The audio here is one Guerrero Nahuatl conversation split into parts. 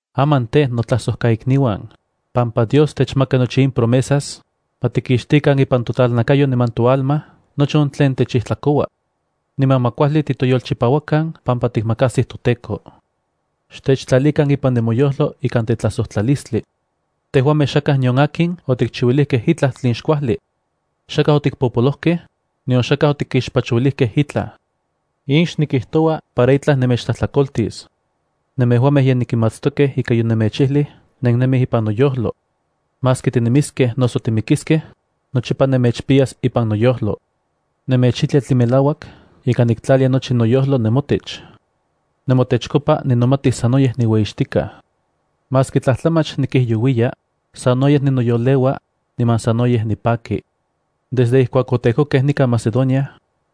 Aman tej, notlajsojkaikniuan, pampa Dios techmaka nochi in promesas, ma tikixtikan ipan totlalnakayo niman toalma nochi on tlen techijtlakoua. Niman ma kuajli titoyolchipauakan pampa tikmakajsij toTEKO. Xtechtlalikan ipan nemoyojlo ikan tetlajsojtlalistli. Tejuamej xakaj nion akin otikchiuilijkej itlaj tlen xkuajli. Xakaj otikpopolojkej, nion xakaj otikixpachouilijkej itlaj. In xnikijtoua para itlaj nemechtlajtlakoltis. Nemejuamej ye nenkimatstokej ika yonemechijlij nennemij ipan noyojlo. Maski tinemiskej noso timikiskej, nochipa nemechpiyas ipan noyojlo. Nemechijlia tlen melauak ika niktlalia nochi noyojlo nemotech. Nemotechkopa nikpiya miyek ueyimatilistli niman nemechtlakaita. Maski tlatlajmach nikijyouiya, sanoyej nechyoleua, niman sanoyej nipaki. Desde ijkuak otejkokej nikan Macedonia,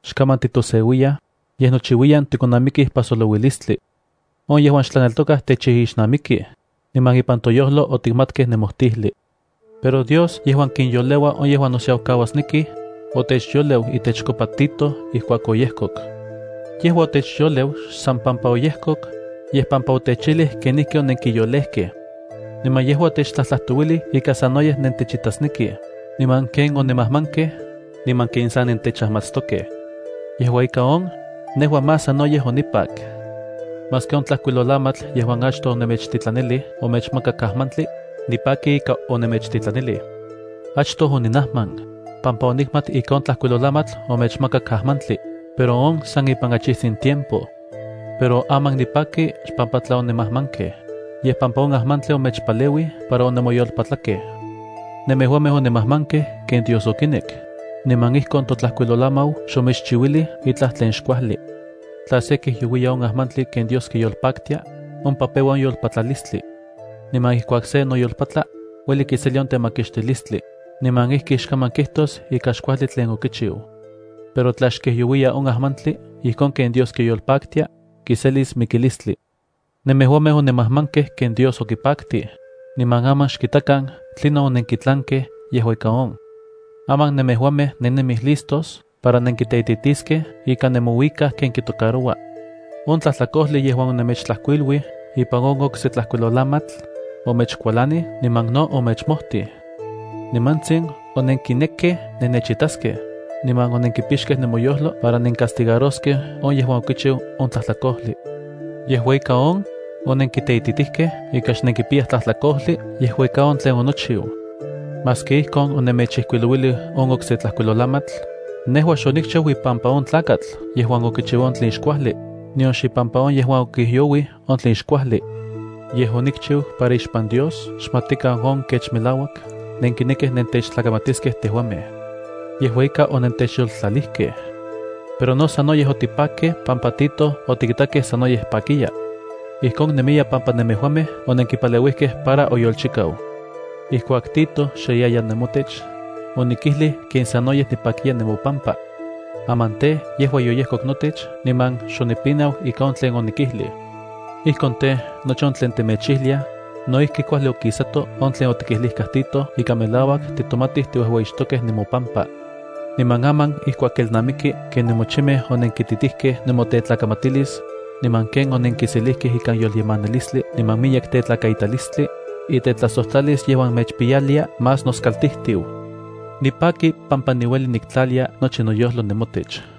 xkaman titoseuiyaj, yej nochiuiyan tikonamikij pajsolouilistli. On yejuan xtlaneltokaj techijixnamikij, niman ipan toyojlo otikmatkej nemojtijli. Pero Dios, yejuan kinyoleua on yejuan nosiaukauasnekij, otechyoleu itechkopa Tito ijkuak oyejkok. Yejua otechyoleu xsan pampa oyejkok, yej pampa otechijlij kenijki onenkiyolejkej. Niman yejua otechtlajtlajtouilij ika sanoyej nentechitasnekij, niman ken onemajmankej, niman ken sa nentechajmatstokej. Yejua ika on, nejua más sanoyej onipak. Maski on tlajkuilolamatl yejuan achtoj onemechtitlanilij omechmakak ajmantli, nipaki ika onemechtitlanilij. Achtoj oninajman, pampa onikmat ika on tlajkuilolamatl omechmakak ajmantli, pero on san ipan achijtsin tiempo. Pero aman nipaki xpampa tla onemajmankej, yej pampa on ajmantli omechpaleuij para onemoyolpatlakej. Nemejuamej onemajmankej ken Dios okinek, niman ijkon totlajkuilolamau xomechchiuilij itlaj tlen xkuajli. Tla se kijyouiya on ajmantli ken Dios kiyolpaktia, ompa peua on yolpatlalistli. Niman ijkuak se noyolpatla, ueli kiselia on temakixtilistli, niman ijki xkaman kijtos ika xkuajli tlen okichiu. Pero tla xkijyouiya on ajmantli ijkon ken Dios kiyolpaktia, kiselis mikilistli. Nemejuamej onemajmankej ken Dios okipaktij, niman aman xkitakan tlinon onenkitlankej yejua ika on. Aman nemejuamej nennemij listos para nenkiteititiskej ika nemouikaj ken kitocaroua. On tlajtlakojli yejuan onemechtlajkuiluij ipan on okse tlajkuilolamatl, omechkualanij niman no omechmojtij. Nimantsin onenkinekkej nennechitaskej, niman onenkipixkej nemoyojlo para nencastigaroskej on yejuan okichiu on tlajtlakojli. Yejua ika on, onenkiteititijkej ika xnenkipiyaj tlajtlakojli yejua ika on tlen onochiu. Maski ijkon onemechijkuilouilij on okse tlajkuilolamatl, nejua xonikchiu ipampa on tlakatl yejuan okichiu on tlen xkuajli, nion xipampa on yejuan okijyouij on tlen xkuajli. Yej onikchiu para ixpan Dios xmatikan on kech melauak nenkinekij nentechtlamatiskej tejuamej. Yejua ika onentechyoltlalijkej. Pero no sanoyej otipakkej pampa Tito otikitakej sanoyej pakiya. Ijkon nemiya pampa nemejuamej onenkipaleuijkej para oyolchikau. Ijkuak Tito xe yaya nemotech, onikijlij ken sanoyej nipakiya nemopampa. Aman tej, yejua yoyejkok notech niman xonipinau ika on tlen onikijlij. Ijkon tej, nochi on tlen temechijliaj, no ijki kuajli okisato on tlen otikijlijkaj Tito ika melauak titomatij tiuejueyixtokej nemopama. Niman aman ijkuak kelnamiki ken nemochimej onenkititijkej nemotetlakamatilis, niman ken onenkiselijkej ikan yolyemanilistli niman miyek tetlakaitalistli, itetlajsojtlalis yejuan mechpiyalia más noskaltijtiu. Nipaki pampa niueli niktlalia nochi noyojlo nemotech.